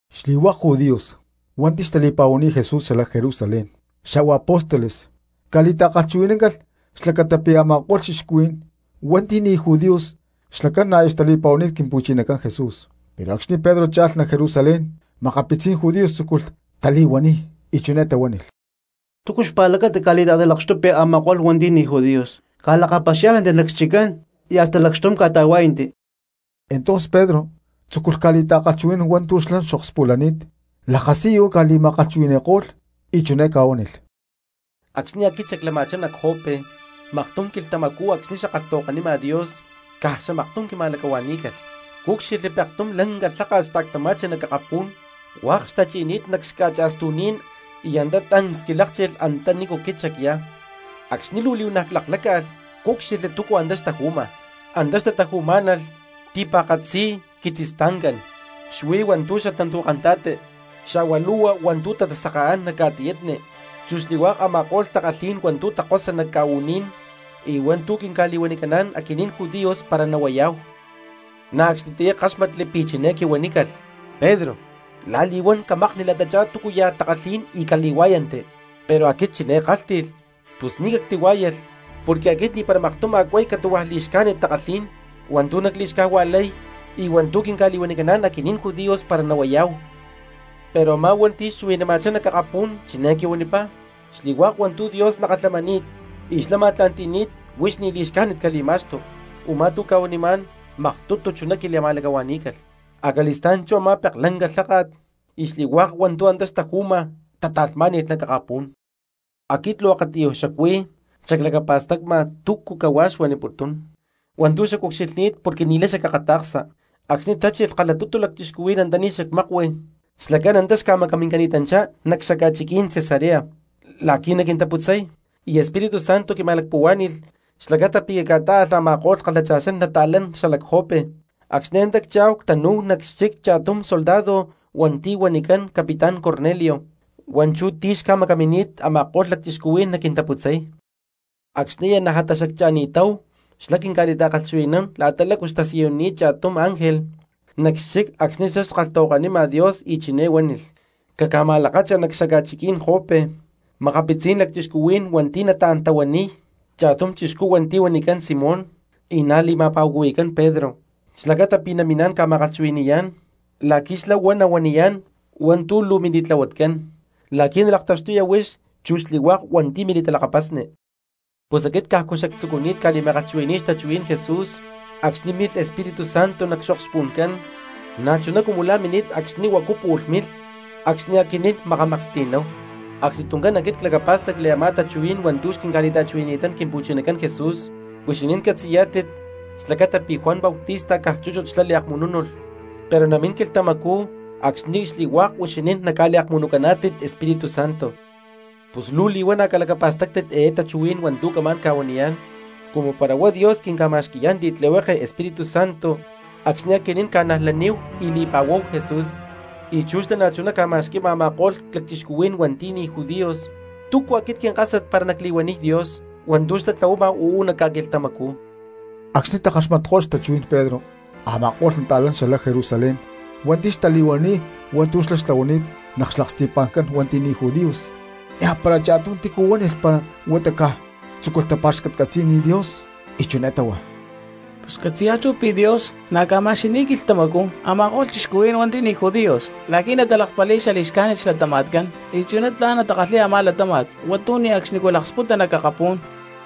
Xli̠hua̠k judíos hua̠nti̠ xtali̠pa̠huani̠t Jesús xalac Jerusalén xa̠hua apóstoles ca̠li̠ta̠kalhchuhui̠náncalh xlacata pi̠ a̠ma̠ko̠lh cristianos hua̠nti̠ ni̠ judíos xlacán na̠ aya xtali̠pa̠huani̠t Quimpu̠chinacán Jesús. Pero acxni̠ Pedro cha̠lh nac Jerusalén makapitzí̠n judíos tzúculh tali̠huaniy, y chiné tahuánilh: —¿Túcu xpa̠lacata ca̠li̠ta̠talakxtupi a̠ma̠ko̠lh hua̠nti̠ ni̠ judíos, ca̠lakapaxiá̠lhnanti nac xchiccán y hasta lacxtum ca̠ta̠huá̠yanti? Entonces Pedro tzúculh ca̠li̠ta̠kalhchuhui̠nán hua̠ntu̠ xlá xokspulani̠t lakasiyu ca̠ma̠lacti̠tumi̠niko̠lh, y chiné ca̠huánilh: —Acxni̠ aquit xaclama̠chá nac Jope, maktum quilhtamacú acxni̠ xackalhtahuakanima Dios caj xamaktum quima̠lacahua̠ní̠calh, cúcxilhli pektum lanca lháka̠t xta̠ctama̠chi nac akapú̠n hua̠k xtachi̠ni̠t nac xca̠cha̠stu̠ní̠n y antá tancs quilákchilh antanícu aquit xacyá. Acxni̠ luu li̠huana̠ clakláca̠lh cúcxilhli túcua antá xtaju̠ma: antá xtataju̠má̠nalh ti̠pa̠katzi quitzistancá̠n, xuí hua̠ntu̠ xatantu̠kanta̠ti xa̠hua lu̠hua hua̠ntu̠ tata̠sakaán nac ca̠tiyatni chu xli̠hua̠k a̠ma̠ko̠lh takalhí̠n hua̠ntu̠ takosa nac ca̠u̠ní̠n, y hua̠ntu̠ quinca̠li̠huanicaná̠n aquinín judíos para nahuayá̠hu. Na̠ acxnitiyá ckáxmatli pi̠ chiné xquihuanimá̠calh: “Pedro, la̠li̠huán camakni la̠tachá túcuya̠ takalhí̠n y cali̠huá̠yanti.” Pero aquit chiné ckálhti̠lh: “Pus ni̠ cactili̠huá̠yalh porque aquit ni̠para maktum a̠ cuay catu̠hua li̠xcájnit takalhí̠n hua̠ntu̠ nacli̠xcajua̠lay y hua̠ntu̠ quinca̠li̠huanicaná̠n aquinín judíos para nahuayá̠hu.” Pero a̠má hua̠nti̠ xchuhui̠nama̠chá nac akapú̠n chiné quihuanipá: “Xli̠hua̠k hua̠ntu̠ Dios lakalhamani̠t y xlá ma̠tla̠nti̠ni̠t huix ni̠ li̠xcájnit cali̠ma̠xtu.” Umá tu̠ cuanimá̠n maktutu chuná quili̠ma̠lacahua̠ní̠calh, acali̠stá̠n chú a̠má peklanca lháka̠t y xli̠hua̠k hua̠ntu̠ antá xtaju̠ma tata̠lhmá̠ni̠lh nac akapú̠n. Aquit luu akatiyuj xacuí xaclacapa̠stacma túcu cahuá xuaniputún hua̠ntu̠ xacucxilhni̠t porque ni̠lay xacakata̠ksa acxni̠ tachilh kalhatutu lacchixcuhuí̠n antaní xacmákui, xlacán antá xca̠macamincani̠tanchá nac xaca̠chiquí̠n Cesarea la̠qui̠ naquintaputzay. Y Espíritu Santo quima̠lacpuhuá̠ni̠lh xlacata pi̠ cacca̠tá̠alh a̠ma̠ko̠lh kalhacha̠xán nata̠lán xalac Jope. Acxni̠ antá ccha̠hu ctanú̠hu nac xchic cha̠tum soldado hua̠nti̠ huanicán capitán Cornelio hua̠nchú ti̠ xca̠macamini̠t a̠ma̠ko̠lh lacchixcuhuí̠n naquintaputzay. Acxni̠ aya najatá xaccha̠ni̠táhu xlá quinca̠li̠ta̠kalhchuhui̠nán la̠ta lácu xtasiyunini̠t cha̠tum ángel nac xchic acxni̠ xlá xkalhtahuakanima Dios y chiné huánilh: “Caca̠ma̠lakacha nac xaca̠chiquí̠n Jope makapitzí̠n lacchixcuhuí̠n hua̠nti̠ nataán tahuaniy cha̠tum chixcú hua̠nti̠ huanicán Simón y na̠ li̠ma̠pa̠cuhui̠cán Pedro xlacata pi̠ naminá̠n ca̠ma̠kalhchuhui̠ni̠yá̠n, la̠qui̠ xlá huá nahuaniyá̠n hua̠ntu̠ luu mili̠tlahuatcán la̠qui̠ nalaktaxtuya huix chu xli̠hua̠k hua̠nti̠ mili̠talakapasni.” Pus aquit cajcu xactzucuni̠t ca̠li̠ma̠kalhchuhui̠ní̠y xtachuhuí̠n Jesús acxni̠ milh Espíritu Santo nac xokspu̠ncán na̠chuná cumu la̠ mini̠t acxni̠ huacu pu̠lh milh acxni̠ aquinín makamaklhti̠náhu. Acxnituncán aquit clacapá̠stacli a̠má tachuhuí̠n hua̠ntu̠ quintica̠huanín Quimpu̠chinacán Jesús: “Huixinín catzi̠yá̠tit xlacata pi̠ Juan Bautista caj chúchut xlá liakmunú̠nalh, pero namín quilhtamacú acxni̠ xli̠hua̠k huixinín naca̠liakmunucaná̠tit Espíritu Santo.” Pus luu li̠huana̠ calacapa̠stáctit eé tachuhuí̠n hua̠ntu̠ camá̠n ca̠huaniyá̠n: Cumu para huá Dios quinca̠ma̠xquí̠n xli̠tlihueke Espíritu Santo acxni̠ aquinín ca̠najlaníhu y li̠pa̠huáhu Jesús, y chú xlá na̠chuná ca̠ma̠xqui̠ma a̠ma̠ko̠lh cristianos hua̠nti̠ ni̠ judíos, ¿túcu aquit quinkásat para nacli̠huaniy Dios hua̠ntu̠ xlá tlahuama uú nac ca̠quilhtamacú? Acxni̠ takaxmatko̠lh xtachuhuí̠n Pedro a̠ma̠ko̠lh nata̠lán xalac Jerusalén hua̠nti̠ xtali̠huanini̠t hua̠ntu̠ xlá xtlahuani̠t nac xlaksti̠pa̠ncán hua̠nti̠ ni̠ judíos, niajpara cha̠tum túcu huánilh huata caj tzúculh tapa̠xcatcatzi̠niy Dios, y chiné táhua: —Pus catzi̠yá̠hu chú pi̠ Dios na̠ ca̠ma̠xqui̠ni̠t quilhtamacú a̠ma̠ko̠lh cristianos hua̠nti̠ ni̠ judíos la̠qui̠ natalakpali̠y xali̠xcájnit xlatama̠tcán y chuná tla̠n natakalhi̠y a̠má latáma̠t hua̠ntu̠ ne̠cxni laksputa nac akapú̠n.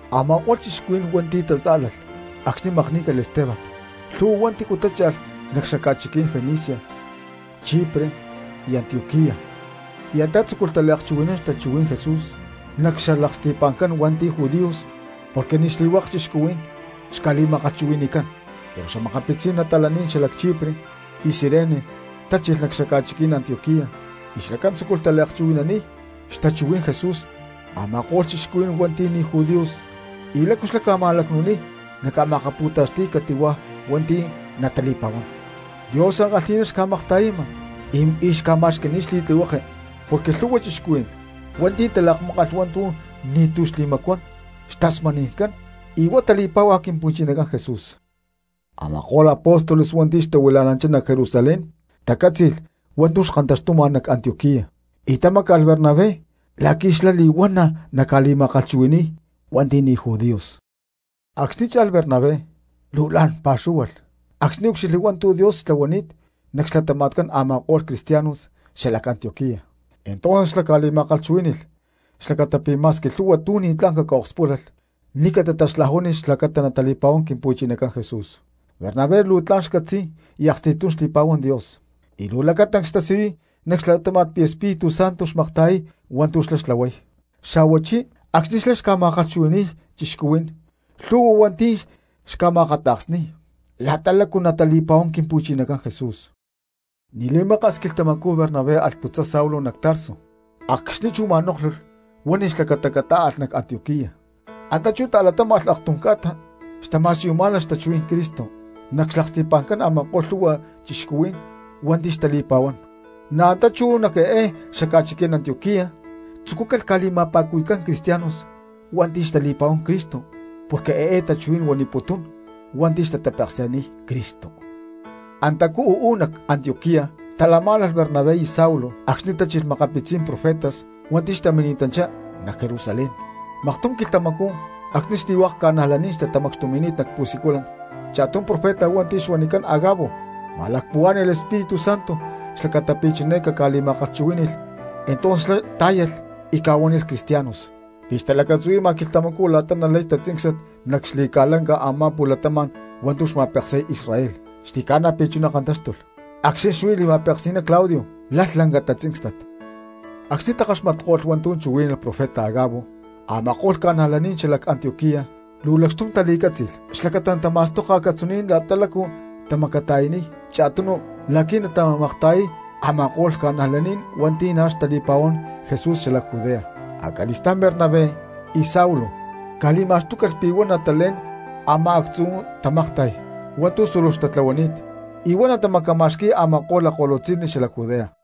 Ama̠ko̠lh cristianos hua̠nti̠ tatzá̠lalh acxni̠ makní̠calh Esteban lhu̠hua hua̠nti̠ tácha̠lh nac xaca̠chiquí̠n Fenicia, Chipre y Antioquía, y antá tzúculh taliakchuhui̠nán xtachuhuí̠n Jesús nac xlaksti̠pa̠ncán hua̠nti̠ judíos porque ni̠ xli̠hua̠k cristianos xca̠li̠ma̠kalhchuhui̠ni̠cán. Pero makapitzí̠n nata̠lán xalac Chipre y Cirene tachilh nac xaca̠chiquí̠n Antioquía y xlacán tzúculh taliakchuhui̠naniy xtachuhuí̠n Jesús a̠ma̠ko̠lh cristianos hua̠nti̠ ni̠ judíos y lácu xlá ca̠ma̠lacnu̠niy naca̠ma̠akapu̠taxti̠y cati̠huá hua̠nti̠ natali̠pa̠huán. Dios ankalhi̠ná xca̠makta̠yama y xca̠ma̠xqui̠ni̠t xli̠tlihueke porque lhu̠hua cristianos hua̠nti̠ talakmákalh hua̠ntu̠ ni̠tu̠ xli̠macuán xtasmani̠ncán y huá tali̠páhua Quimpu̠chinacán Jesús. Ama̠ko̠lh apóstoles hua̠nti̠ xtahuila̠nanchá nac Jerusalén tacátzi̠lh hua̠ntu̠ xkantaxtuma nac Antioquía y tamáca̠lh Bernabé la̠qui̠ xlá li̠huana̠ naca̠ma̠kalhchuhui̠ni̠y hua̠nti̠ ni̠ judíos. Acxni̠ cha̠lh Bernabé luu la̠n pa̠xúhualh acxni̠ úcxilhli hua̠ntu̠ Dios xtlahuani̠t nac xlatama̠tcán a̠ma̠ko̠lh cristianos xalac Antioquía; entonces xlá ca̠li̠ma̠kalhchuhuí̠ni̠lh xlacata pi̠ ma̠squi lhu̠hua tu̠ ni̠tlá̠n caca̠okspúlalh ni̠ catataxlajuáni̠lh xlacata natali̠pa̠huán Quimpu̠chinacán Jesús. Bernabé luu tla̠n xcatzi̠y y aksti̠tum xli̠pa̠huán Dios, y luu lacatancs xtasiyuy nac xlatáma̠t pi̠ Espíritu Santo xmakta̠yay hua̠ntu̠ xlá xtlahuay, xa̠huachí acxni̠ xlá xca̠ma̠kalhchuhui̠ni̠y cristianos lhu̠hua hua̠nti̠ xca̠ma̠akata̠ksni̠y la̠ta lácu natali̠pa̠huán Quimpu̠chinacán Jesús. Ni̠ li̠maka̠s quilhtamacú Bernabé alh putzay Saulo nac Tarso, acxni̠ chú ma̠nóklhulh huánilh xlacata catá̠alh nac Antioquía. Antá chú talatáma̠lh aktum ca̠ta xtama̠siyumá̠nalh xtachuhuí̠n Cristo nac xlaksti̠pa̠ncán a̠ma̠ko̠lh lhu̠hua cristianos hua̠nti̠ xtali̠pa̠huán. Na̠ antá chú nac eé xaca̠chiquí̠n Antioquía tzucúcalh ca̠li̠ma̠pa̠cuhui̠cán cristianos hua̠nti̠ xtali̠pa̠huán Cristo porque eé tachuhuí̠n huamputún hua̠nti̠ tatapeksi̠niy Cristo. Antacú uú nac Antioquía xtalamá̠nalh Bernabé y Saulo acxni̠ tachilh makapitzí̠n profetas hua̠nti̠ xtamini̠tanchá nac Jerusalén. Maktum quilhtamacú acxni̠ xli̠hua̠k ca̠najlaní̠n xtatamacxtumi̠ni̠t nac pu̠siculan, cha̠tum profeta hua̠nti̠ xuanicán Agabo ma̠lacpuhuá̠ni̠lh Espíritu Santo xlacata pi̠ chiné caca̠li̠ma̠kalhchuhuí̠ni̠lh; entonces xlá tá̠yalh y ca̠huánilh cristianos pi̠ xtalacatzuhui̠ma quilhtamacú la̠ta nalay tatzíncstat nac xli̠ca̠lanca a̠má pu̠latama̠n hua̠ntu̠ xma̠peksi̠y Israel. Xli̠ca̠na pi̠ chuná kantáxtulh acxni̠ xuí li̠ma̠peksi̠ná Claudio lalh lanca tatzíncstat. Acxni̠ takaxmatko̠lh hua̠ntu̠ chuhuí̠nalh profeta Agabo, a̠ma̠ko̠lh ca̠najlaní̠n xalac Antioquía luu lacxtum tali̠cátzi̠lh xlacata natama̠stoka acatzuní̠n la̠ta lácu tamacata̠yaniy cha̠tunu la̠qui̠ natamakta̠yay a̠ma̠ko̠lh cristianos hua̠nti̠ na̠ xtali̠pa̠huán Jesús xalac Judea. Acali̠stá̠n Bernabé y Saulo ca̠li̠ma̠xtúcalh pi̠ huá natalé̠n a̠má actzu̠ tamakta̠y hua̠ntu̠ súluj xtatlahuani̠t, y huá natamacama̠xqui̠y a̠ma̠ko̠lh lakko̠lutzi̠nni xalac Judea.